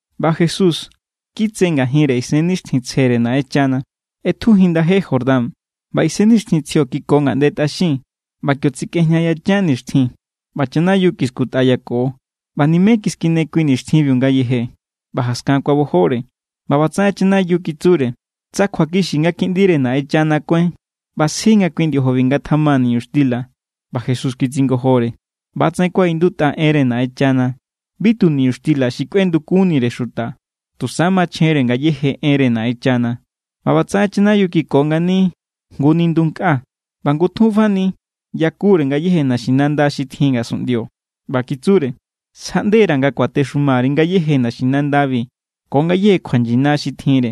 ꞌBa Jesús, kitse ngajinre Isennixtjintsjere Naꞌenchana, ꞌetjujin ndaje Jordán, ꞌba Isennixtjintsjio kiko ngaꞌnde tꞌaxin. ꞌBa kio tsikꞌejña yachan nixtjin, ꞌba chanayiu kiskutꞌayako. ꞌBa nimé kiskine kui nixtjinbiu ngayeje, ꞌba jaskan kuabojore. ꞌBa ꞌbatsaꞌen chanayiu kitsure: —Tsa kjuakixi nga Kiꞌndire Naꞌenchana kuáin, ꞌba sji nga kui ndiojobi ngatjama niñuxtila. ꞌBa Jesús kitsingojore: —ꞌBa=tsaꞌen kuaꞌindutꞌa enre Naꞌenchana: “Bi tu niñuxtila xi kꞌuendukunnire xuta, tusa machjenre ngayéje enre Naꞌenchana.” ꞌBa ꞌbatsaꞌen chanayiu kiko ngani jngu nindu nkꞌa, ꞌba ngutjun fani yakure ngayéje naxinanda xi tjin ngasunꞌndio. ꞌBa kitsure: —Sjaꞌndera̱ nga kuatexumari ngayéje naxinandabi ko ngayéje kjuachan xi tjinre.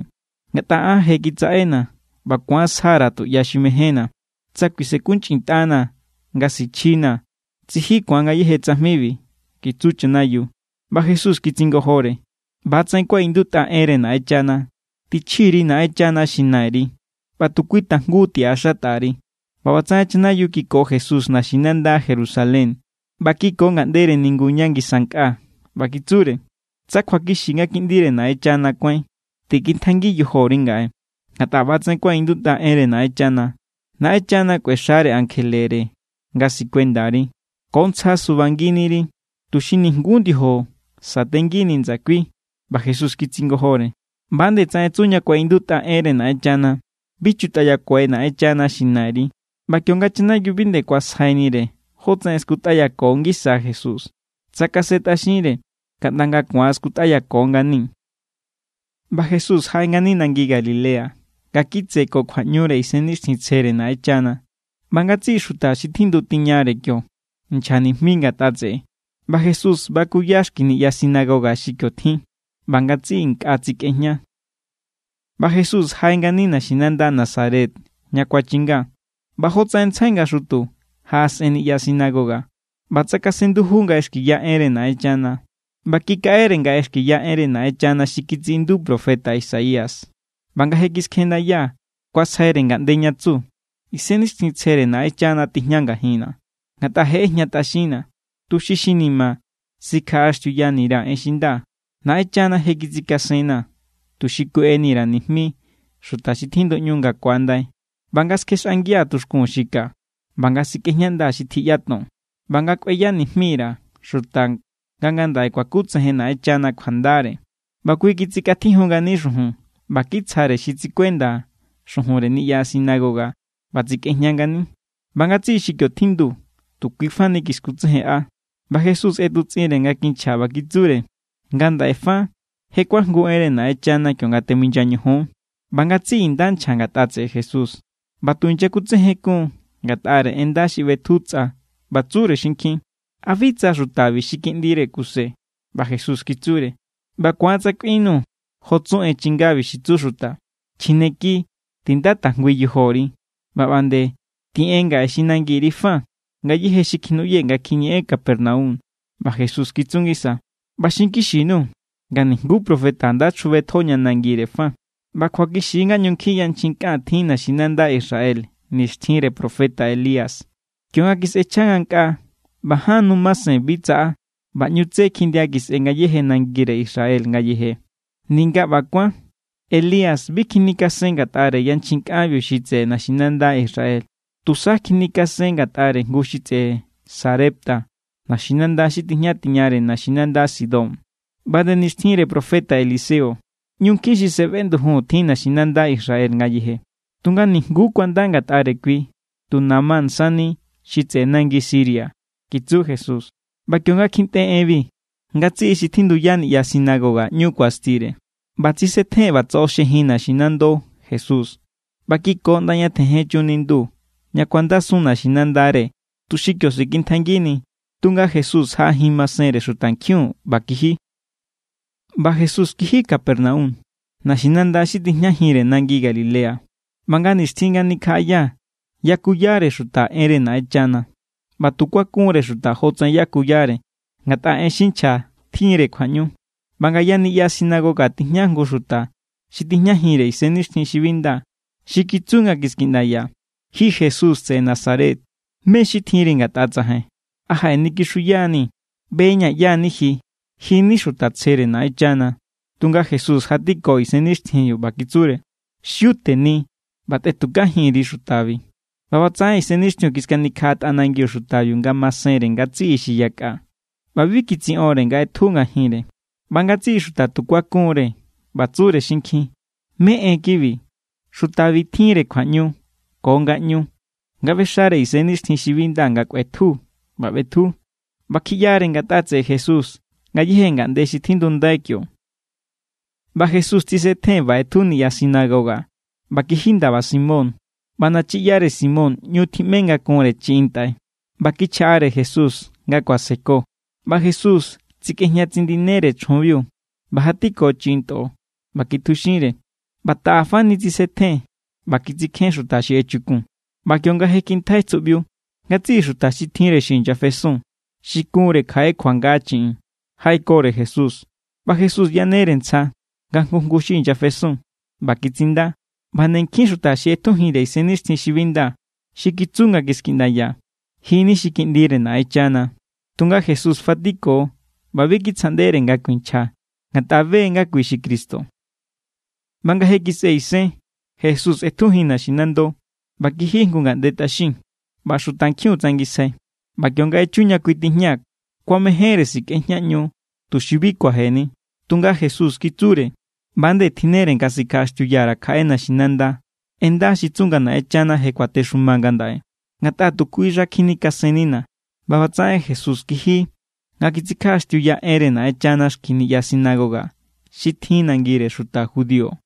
Ngatꞌa an je kitsaꞌena̱ ꞌba ku̱an sja_ra̱ tuꞌya xi mejénna̱. Tsa kuisenkunchꞌintꞌanaa̱ nga sichjinaa̱, tsiji ku̱an ngayéje tsajmibiu —kitsu chanayiu. ꞌBa Jesús kitsingojore: —ꞌBa=tsaꞌen kuaꞌindutꞌa enre Naꞌenchana: “Tichji_ri Naꞌenchana xi Nairi, ꞌba tu kui tajngu tiꞌaxatꞌa_ri.” ꞌBa ꞌbatsaꞌen chanayiu kiko Jesús naxinanda Jerusalén ꞌba kiko ngaꞌndere ningu ña ngisa nkꞌa. ꞌBa kitsure: —Tsa kjuakixi nga Kiꞌndire Naꞌenchana kuáin, tikintjaingi yojori ngaꞌe. Ngatꞌa ꞌba=tsaꞌen kuaꞌindutꞌa enre Naꞌenchana: Naꞌenchana kꞌuexare ankjelere nga sikuendari. Ko ntsja subanginiri, tuxi nijnguú ndiojo satengini ndsakui. ꞌBa Jesús kitsingojore: —ꞌBa nde tsaꞌen tsu ña kuaꞌindutꞌa enre Naꞌenchana: “Bi chutꞌayakuai Naꞌenchana, xi Nairi.” ꞌBa kionga chanayiu bi nde kuasjainire jótsaꞌen skutꞌayako ngisa Jesús, tsakasentꞌaxinre kaꞌnda nga ku̱an skutꞌayako ngani. ꞌBa Jesús jaꞌe ngani nangi Galilea nga kitse ko kjuaꞌñure Isennixtjintsjere Naꞌenchana, ꞌba ngatsiꞌi xuta xi tjindu tiñare kio nchja nijmi ngatꞌa tseꞌe. ꞌBa Jesús bakuya xki niꞌya sinagoga xi kio tjin, ꞌba ngatsiꞌi nkꞌa kitsikꞌejña. ꞌBa Jesús jaꞌe ngani naxinanda Nazaret ña kuachinga. ꞌBa jotsaꞌen ntsjai nga xutu jaꞌasꞌen niꞌya sinagoga, ꞌba tsakasen nduju nga ꞌexkiya enre Naꞌenchana. ꞌBa kikaꞌere nga ꞌexkiya enre Naꞌenchana xi kitsiꞌindu profeta Isaías. ꞌBa nga je kiskjendaya, kuasjaire ngaꞌnde ña tsu: Isennixtjintsjere Naꞌenchana tijña ngajinna̱, ngatꞌa je ꞌejñatꞌaxinna̱ tuxi xi ni̱ma̱ sikjaꞌaxtiuyani_ra̱ en xi nda. Naꞌenchana je kitsikasenna̱, tuxi kueꞌeni_ra̱ nijmi xuta xi tjinduꞌñu nga ku̱andai, ꞌba nga skjexꞌangia̱ tuxkun xi ka, ꞌba nga sikꞌejñandaa̱ xi tjiꞌyaton; ꞌba nga kꞌueya nijmi_ra̱ xuta nga ngandaꞌe kuakutsejen Naꞌenchana kjuandare. ꞌBa kui kitsikꞌatjijun ngani xujun ꞌba kitsjare xi tsikuenda xujunre niꞌya sinagoga ꞌba tsikꞌejña ngani. ꞌBa ngatsiꞌi xi kio tjindu tu kui fa ni kiskutsejenꞌa. ꞌBa Jesús ꞌetutsꞌinre nga kinchja ꞌba kitsure: —Ngandaꞌe fa je kuajngu enre Naꞌenchana kionga teminya ñojon. ꞌBa ngatsiꞌi nda nchja ngatꞌa tseꞌe Jesús ꞌba tu inyakutsejenkun ngatꞌare en nda xi ꞌbetju tsꞌa, ꞌba tsure xinkjin: —¿A bi tsa xutabi xi kiꞌndire Kuse? ꞌBa Jesús kitsure: —ꞌBa ku̱an tsa kꞌuinnu jo tsu en chingabi xi tsu xuta: “Chjineki, tinda tajngui yojori”, ꞌba ꞌba nde: “Tiꞌen ngaꞌe xi nangiri fa ngayéje xi kjinuꞌyee̱ nga kjiñeꞌen Capernaum.” ꞌBa Jesús kitsu ngisa: —ꞌBa xinkixi_nuu̱ nga nijnguú profeta nda chjubetjo ña nangire fa. ꞌBa kjuakixi nga ꞌñu nkjin yanchjin kꞌan tjin naxinanda Israel nixtjinre profeta Elías, kionga kisꞌechja ngankꞌaa ꞌba ján nu masen bi tsaꞌa ꞌba ꞌñu tsé kjindia kisꞌe ngayéje nangire Israel ngayeje. Ninga ꞌba kuán, Elías bi kjinikasen ngatꞌare yanchjin kꞌanbiu xi tseꞌe naxinanda Israel, tusa kjinikasen ngatꞌare jngu xi tseꞌe Sarepta, naxinanda xi tijña tiñare naxinanda Sidón. ꞌBa nde nixtjinre profeta Eliseo, ꞌñu nkjin xi sefeꞌndujun tjin naxinanda Israel ngayeje. Tunga nijnguú kuanda ngatꞌare kui, tu Naamán sani, xi tseꞌe nangi Siria —kitsu Jesús. ꞌBa kionga kjintꞌe enbi, ngatsiꞌi xi tjinduya niꞌya sinagoga, ꞌñu kuastire. ꞌBa tsisetjen ꞌba tsoꞌoxjejin naxinando Jesús, ꞌba kiko ꞌnda ña tjenjen chun nindu ña kuandasun naxinandare, tuxi kio sikintjaingini. Tunga Jesús jaꞌajin masenre xutankjiun ꞌba kiji. ꞌBa Jesús kiji Capernaum, naxinanda xi tijñajinre nangi Galilea. ꞌBa nga nixtjin nga nikjaꞌaya yakuyare xuta enre Naꞌenchana. ꞌBa tu kuakunre xuta jotsaꞌen yakuyare, ngatꞌa en xi nchja tjinre kjuaꞌñu. ꞌBa ngaya niꞌya sinagoga tijña jngu xuta xi tijñajinre isennixtjin xi bi nda xi kitsu nga kiskiꞌndaya: —Ji Jesús tseꞌe Nazaret, ¿mé= xi tjinri ngatꞌa tsajain? ¿A jaꞌenikixuya=ni̱? ꞌBeña̱ ꞌyá= ni ji. Ji= ni xuta tsjere Naꞌenchana. Tunga Jesús jatiko isennixtjinbiu ꞌba kitsure: —¡Xiu teni, ꞌba tꞌetukajin_ri xutabi! ꞌBa ꞌbatsaꞌen isennixtjiun kiskanikjaꞌa tꞌanangiu xutabiu ngamasenre ngatsiꞌi xi yakꞌa, ꞌba bi kitsiꞌonre nga ꞌetju ngajinre. ꞌBa ngatsiꞌi xuta tu kuakun=re ꞌba tsure xinkjin: —¿Mé= en kibi? Xutabi tjinre kjuaꞌñu ko ngaꞌñu nga ꞌbexare isennixtjin xi bi nda nga kꞌuetju, ꞌba ꞌbetju. ꞌBa kjiꞌyare ngatꞌa tseꞌe Jesús ngayéje ngaꞌnde xi tjindundai kio. ꞌBa Jesús tsisetjen ꞌba ꞌetju niꞌya sinagoga ꞌba kiji ndaba Simón. ꞌBa nanyiꞌyare Simón ꞌñu tjiꞌme nga kunre chiꞌin ntꞌai, ꞌba kichjaꞌare Jesús nga kuaseko. ꞌBa Jesús tsikꞌejña tsindinere chjunbiu ꞌba jatiko chiꞌin ntꞌo, ꞌba kitjuxinre, ꞌba taꞌa fani tsisetjen ꞌba kitsikjén xuta xi echukun. ꞌBa kionga je kintjai tsuꞌbiu, ngatsiꞌi xuta xi tjinre xi inyafesun xi kunre kjaꞌe kjuanga chiꞌin, jaꞌekore Jesús. ꞌBa Jesús yanere ntsja nga jngu jngu xi inyafesun, ꞌba kitsinda. ꞌBa nde nkjin xuta xi ꞌetjujinre isennixtjin xi bi nda xi kitsu nga kiskiꞌndaya: —¡Ji= ni xi Kiꞌndire Naꞌenchana! Tunga Jesús fatiko ꞌba bi kitsjaꞌndere nga kuinchja, ngatꞌa be= nga kui xi Cristo. ꞌBa nga je kisꞌe isen, Jesús ꞌetjujin naxinando, ꞌba kiji jngu ngaꞌnde tꞌaxin. ꞌBa xutankjiun tsangisjai. ꞌBa kionga echu ña kui tijña, kuamejénre sikꞌejñaꞌñu, tuxi bi kuajeni. Tunga Jesús kitsure: —ꞌBa=nde tjinnere nga sikjaꞌaxtiuya_ra̱ kjaꞌe naxinanda en nda xi tsu nga Naꞌenchana je kuatexuma ngandaꞌe. Ngatꞌa tu kui xa kjinikasennina̱. ꞌBa ꞌbatsaꞌen Jesús kiji nga kitsikjaꞌaxtiuya enre Naꞌenchana xki niꞌya sinagoga xi tjin nangire xuta Judío.